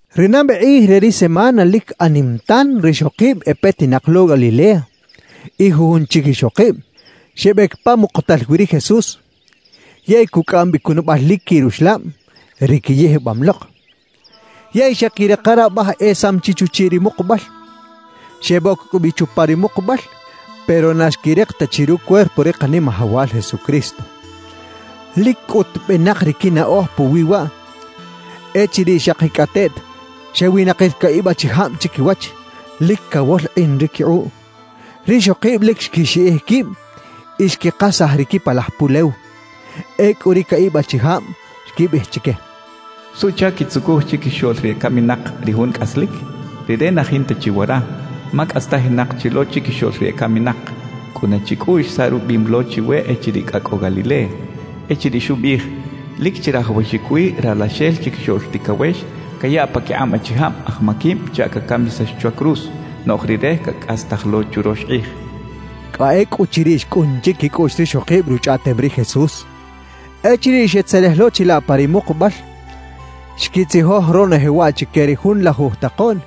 Ri nabe kꞌij re ri semana lic anim tan rixokib e petinak lo Galilea y jujun chic ixokib, xebec pa mukutal wi ri Jesús, yey cucꞌaꞌam bi cunabal lic quiꞌ ruxlab, ri quiyijbam lok. Yey xeꞌquirika rabaj esam chi chuchiꞌ ri mukubal. Xeboc cꞌu bi chupa ri mukubal, pero na xquirik ta chi rucuerpo ri Kanimajawal Jesucristo. Lic cꞌut benak ri quinaꞌoj puwi waꞌ, echiriꞌ xakicꞌateꞌt xewinakir caꞌib achijab chiquiwach, lic cawolkꞌin ri quikꞌuꞌ. Rixokib lic xquixiꞌij quib y xquikasaj ri quipalaj pulew. Ecꞌu ri caꞌib achijab xquibiꞌij chique: —¿Suꞌchac quitzucuj chiquixoꞌl ri ecaminak ri Jun cꞌaslic? Rire na jinta chi wara, ma cꞌastajinak chi lo chiquixoꞌl ri ecaminak. Cꞌuna chicꞌuꞌx saꞌ rubiꞌim lo chiwe echiriꞌ cꞌa cꞌo Galilea, echiriꞌ xubiꞌij: “Lic chirajawaxic wi Ralaxel Chiquixoꞌl Ticawex cayaꞌ paquikꞌab achijab aj maquib chaꞌ cacamisax chwa cruz, noꞌj Rire cacꞌastaj lo churox kꞌij” —xechaꞌ. Cꞌa ecꞌuchiriꞌ xcꞌun chiquicꞌuꞌx rixokib ruchꞌaꞌtem ri Jesús. Echiriꞌ xetzelej lo chilaꞌ pa ri mukubal, xquitzijoj ronoje waꞌ chique ri junlajuj takoꞌn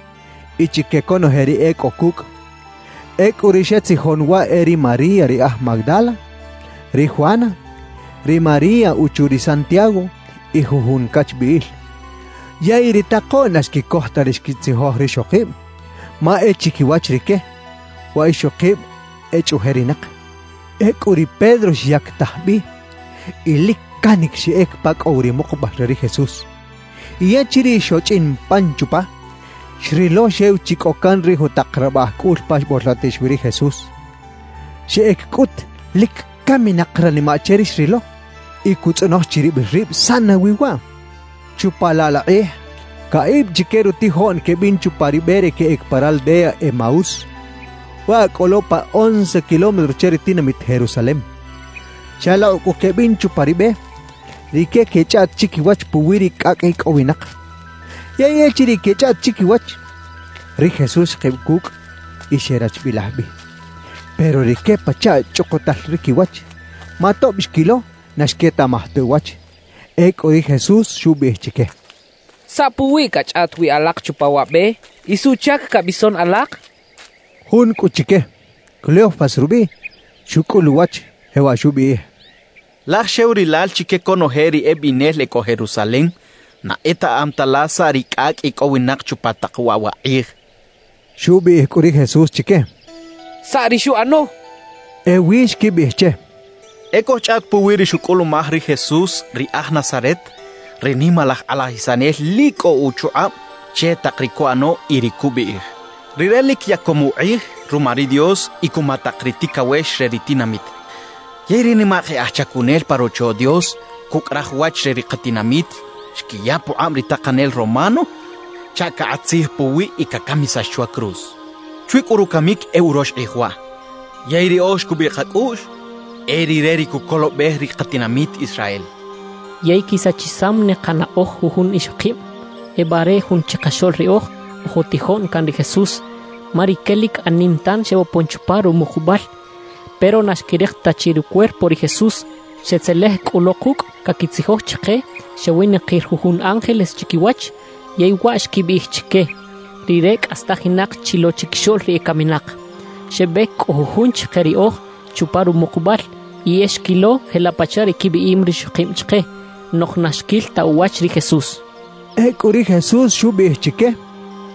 y chique conoje ri e cꞌo cucꞌ. Ecꞌu ri xetzijon waꞌ e ri María ri aj Magdala, ri Juana, ri María uchu ri Santiago y jujun cachbiꞌil. Yey ri takoꞌn na xquicoj ta ri xquitzijoj rixokib, ma e chiquiwach rique, wa ixokib echꞌuꞌjerinak. Ecꞌu ri Pedro xyactaj bi y lic canic xeꞌec pa cꞌo wi ri mukubal re ri Jesús. Y echiriꞌ xochꞌin pan chupa, xrilo xew chi cꞌo can ri jutak rabaꞌj cꞌul pa xbolkꞌotix wi ri Jesús. Xeꞌec cꞌut lic caminak ranimaꞌ che ri xrilo y cutzꞌonoj chiribil rib saꞌ nawi waꞌ. Chupa laꞌ laꞌ kꞌij, caꞌib chique rutijoꞌn quebin chupa ri be re queꞌec pa raldea Emaús, waꞌ cꞌo lo pa once kilómetro che ri tinamit Jerusalem. Xalokꞌ cꞌu quebin chupa ri be, rique quechꞌaꞌt chiquiwach puwi ri cꞌacꞌ icꞌowinak. Yey echiriꞌ quechꞌaꞌt chiquiwach, ri Jesús xkib cucꞌ y xerachbilaj bi. Pero rique pachaꞌ chꞌukutal ri quiwach, ma tob xquilo na xquetaꞌmaj ta uwach. Ecꞌu ri Jesús xubiꞌij chique: —¿Saꞌ puwiꞌ cachꞌaꞌt wi alak chupa wa be? ¿Y suꞌchac cabison alak? —xchaꞌ. Jun cꞌu chique, Cleofas rubiꞌ, xucꞌul uwach, jewaꞌ xubiꞌij: —Laj xew rilal chique conoje ri ebinel e cꞌo Jerusalem na etaꞌam ta la saꞌ ri cꞌacꞌ icꞌowinak chupa tak waꞌ wa kꞌij —xchaꞌ. Xubiꞌij cꞌu ri Jesús chique: —¿Saꞌ ri xuꞌano? —xchaꞌ. Ewi xquibiꞌij che: —E cojchꞌaꞌt puwi ri xucꞌulumaj ri Jesús ri aj Nazaret, ri nimalaj kꞌalajisanel lic cꞌo uchukꞌab che tak ri cuꞌano y ri cubiꞌij; rire lic yacom ukꞌij ruma ri Dios y cuma tak ri ticawex re ri tinamit. Yey ri nimak e aj chacunel pa Rocho Dios cucꞌ raj wach re ri katinamit xquiya pukꞌab ri takanel romano chaꞌ cakꞌat tzij puwiꞌ y cacamisax chwa cruz. Chwi cꞌu rucamic e urox kꞌij waꞌ. Yey riꞌoj xcubiꞌ kacꞌuꞌx e rire ri cucolobej ri katinamit Israel. »Yey quisachisam ne kanaꞌoj jujun ixokib ebare jun chikaxoꞌl riꞌoj oj utijoꞌn can ri Jesús. Ma rique lic anim tan xebopon chupa rumukubal, pero na xquirik ta chi rucuerpo ri Jesús. Xetzelej cꞌu lo kucꞌ, caquitzijoj chike xewinakir jujun ángeles chiquiwach, yey waꞌ xquibiꞌij chique: “Rire cꞌastajinak chi lo chiquixoꞌl ri ecaminak.” Xebec cꞌu jujun chike riꞌoj chupa rumukubal y e xquilo jelaꞌ pachaꞌ ri quibiꞌim rixokib chike. Noꞌj na xquil ta uwach ri Jesús —xechaꞌ. Ecꞌu ri Jesús xubiꞌij chique: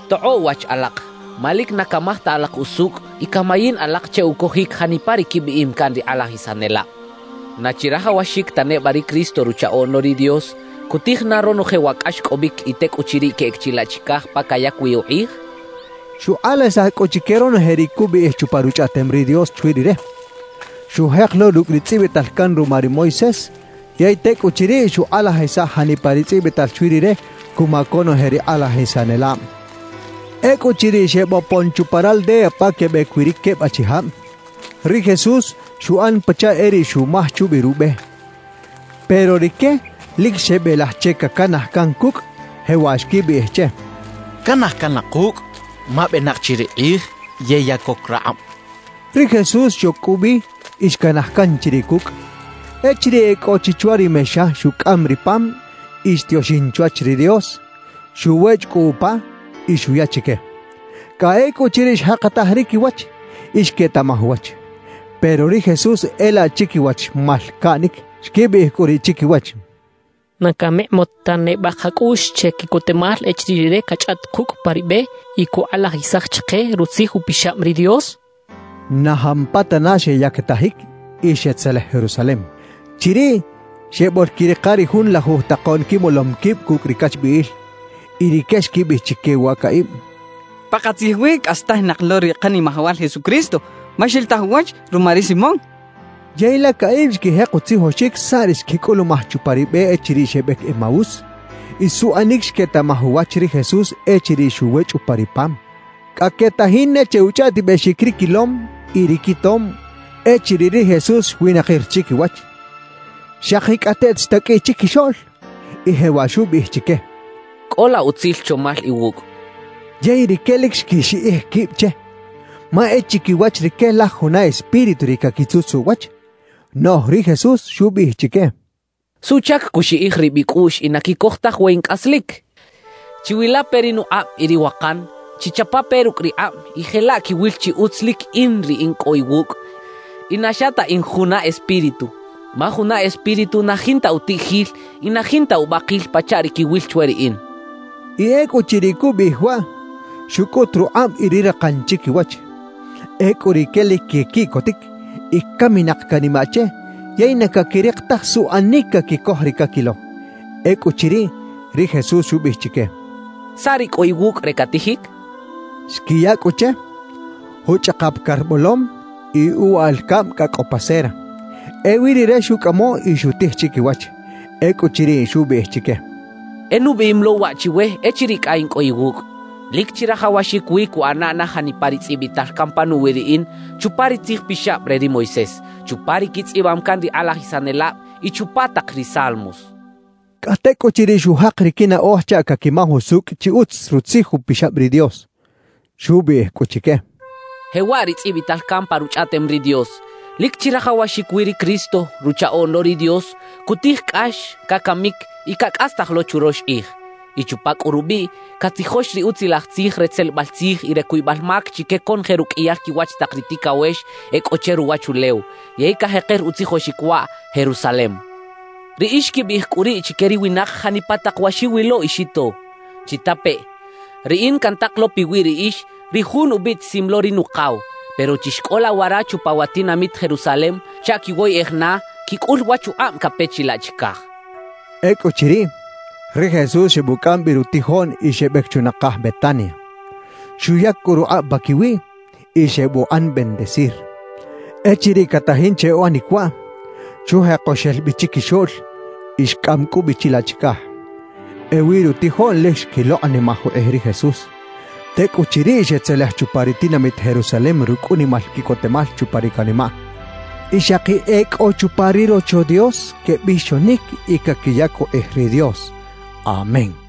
—¡Tokꞌoꞌ wach alak ma lic na camaj ta alak usucꞌ y camayin alak che ucojic janipa ri quibiꞌim can ri kꞌalajisanelab! ¿Na chirajawaxic ta neba ri Cristo, Ruchaꞌoꞌn lo ri Dios, cutij na ronoje wa cꞌaxcꞌobic y tecꞌuchiriꞌ queꞌec chilaꞌ chicaj pa cayac wi ukꞌij? —xchaꞌ. Xukꞌalajisaj cꞌu chique ronoje ri cubiꞌij chupa Ruchꞌaꞌtem ri Dios chwi Rire, xujek lo rucꞌ ri tzꞌibital can ruma ri Moisés yey tecꞌuchiriꞌ xukꞌalajisaj janipa ri tzꞌibital chwi Rire cuma conoje ri kꞌalajisanelab. Ecꞌuchiriꞌ xebopon chupa raldea pa quebec wi ri queb achijab, ri Jesús xuꞌan pachaꞌ e riꞌ xumaj chubi rube. Pero rique lic xebelaj che cacanaj can cucꞌ, jewaꞌ xquibiꞌij che: —Canaj can la kucꞌ, ma benak chi ri kꞌij yey ya coc rakꞌab —xechaꞌ. Ri Jesús xoc cꞌu bi y xcanaj can chiriꞌ cucꞌ. Echiriꞌ e cꞌo chi chwa ri mexa, xucꞌam ri pam y xtioxin chwach ri Dios, xuwechꞌ cꞌu upa y xuya chique. Cꞌa ecꞌuchiriꞌ xjakataj ri quiwach y xquetaꞌmaj uwach. Pero ri Jesús e laꞌ chiquiwach xmalcaꞌnic. Xquibiꞌij cꞌu riꞌ chiquiwach: —¿Na camikꞌmot ta neba kacꞌuꞌx che quiꞌcotemal echiriꞌ rire cachꞌaꞌt kucꞌ pa ri be y cukꞌalajisaj chike Rutzij Upixab ri Dios? —xechaꞌ. Na jampatana xeyactajic y xetzelej Jerusalem. Chiriꞌ xeboꞌlquirika ri junlajuj takoꞌn quimolom quib cucꞌ ri cachbiꞌil. Y rique xquibiꞌij chique wa caꞌib: «¡Pakatzij wi cꞌastajinak lo ri Kanimajawal Jesucristo ma xilitaj uwach ruma ri Simón!» quechaꞌ. Yey la caꞌib xquijek utzijoxic saꞌ ri xquicꞌulumaj chupa ri be echiriꞌ xebec Emaús y suꞌanic xquetaꞌmaj uwach ri Jesús echiriꞌ xuwechꞌ upa ri pam. Cꞌa quetajin ne che uchꞌaꞌtibexic ri quilom y ri quitom, echiriꞌ ri Jesús xwinakir chiquiwach, xakicꞌateꞌt xtaqꞌuiꞌ chiquixoꞌl y jewaꞌ xubiꞌij chique: —Cꞌola utzil chomal iwucꞌ —xchaꞌ. Yey rique lic xquixiꞌij quib che, ma e chiquiwach rique laj juna espíritu ri caquitzutzaꞌ uwach. Noꞌj ri Jesús xubiꞌij chique: —¿Suꞌchac cuxiꞌij rib icꞌuꞌx y na quicoj taj we in cꞌaslic? Chiwilape ri nukꞌab y ri wakan; chichapape rucꞌ rikꞌab y jelaꞌ quiwil chi utz lic in ri in cꞌo iwucꞌ y na xa ta in juna espíritu, ma juna espíritu na jinta utiꞌjil y na jinta ubakil pachaꞌ ri quiwil chwe riꞌin —xchaꞌ. Y ecꞌuchiriꞌ cubiꞌij waꞌ, xucꞌut rukꞌab y ri rakan chiquiwach. Ecꞌu rique lic quequiꞌcotic y caminak canimaꞌ che yey na caquirik taj suꞌanic caquicoj ri caquilo. Ecꞌuchiriꞌ, ri Jesús xubiꞌij chique: —¿Saꞌ ri cꞌo iwucꞌ re catijic? —xchaꞌ. Xquiya cꞌu che, juchꞌakap car bolom y uwaꞌal cab cꞌa cꞌo pa cera. Ewi Rire xucꞌamo y xutij chiquiwach. Ecꞌuchiriꞌ, xubiꞌij chique: —E nubiꞌim lo waꞌ chiwe echiriꞌ cꞌa in cꞌo iwucꞌ: Lic chirajawaxic wi cuꞌana na janipa ri tzꞌibital can panuwi riꞌin chupa ri Tzij Pixab re ri Moisés, chupa ri quitzꞌibam can ri kꞌalajisanelab y chupa tak ri Salmos —xchaꞌ. Cꞌa tecꞌuchiriꞌ xujak ri quinaꞌoj chaꞌ caquimaj usucꞌ chi utz Rutzij Upixab ri Dios. Xubiꞌij cꞌu chique: —Jewaꞌ ri tzꞌibital can pa Ruchꞌaꞌtem ri Dios: Lic chirajawaxic wi ri Cristo, Ruchaꞌoꞌn lo ri Dios, cutij cꞌax, cacamic y cacꞌastaj lo churox kꞌij; y chupa cꞌu rubiꞌ, catzijox ri Utzilaj Tzij re tzelebal tzij y re cuybal mac chique conoje ruqꞌuiyal quiwach tak ri ticawex e cꞌo che ruwachulew, yey cajeker utzijoxic waꞌ Jerusalem. Riꞌix quibiꞌij cꞌu riꞌ chique ri winak janipa tak wa xiwilo y xito. Chitapeꞌ: Riꞌin cantak lo piwi riꞌix ri Jun ubiꞌtisim lo ri Nukaw; pero chixcꞌola wara chupa wa tinamit Jerusalem chaꞌ quiwoyꞌej na quicꞌul wa chukꞌab cape chilaꞌ chicaj —xchaꞌ. Ecꞌuchiriꞌ, ri Jesús xebucꞌam bi rutijoꞌn y xebec chunakaj Betania. Xuyac cꞌu rukꞌab paquiwiꞌ y xebuꞌan bendecir. Echiriꞌ catajin che uꞌanic waꞌ, xujeko xel bi chiquixoꞌl y xcꞌam cꞌu bi chilaꞌ chicaj. Ewi rutijoꞌn lic xquilokꞌnimaj ukꞌij ri Jesús. Tecꞌuchiriꞌ xetzelej chupa ri tinamit Jerusalem rucꞌ unimal quiꞌcotemal chupa ri canimaꞌ. Y xaki e cꞌo chupa ri Rocho Dios, quebixonic y caquiyac ukꞌij ri Dios. Amén.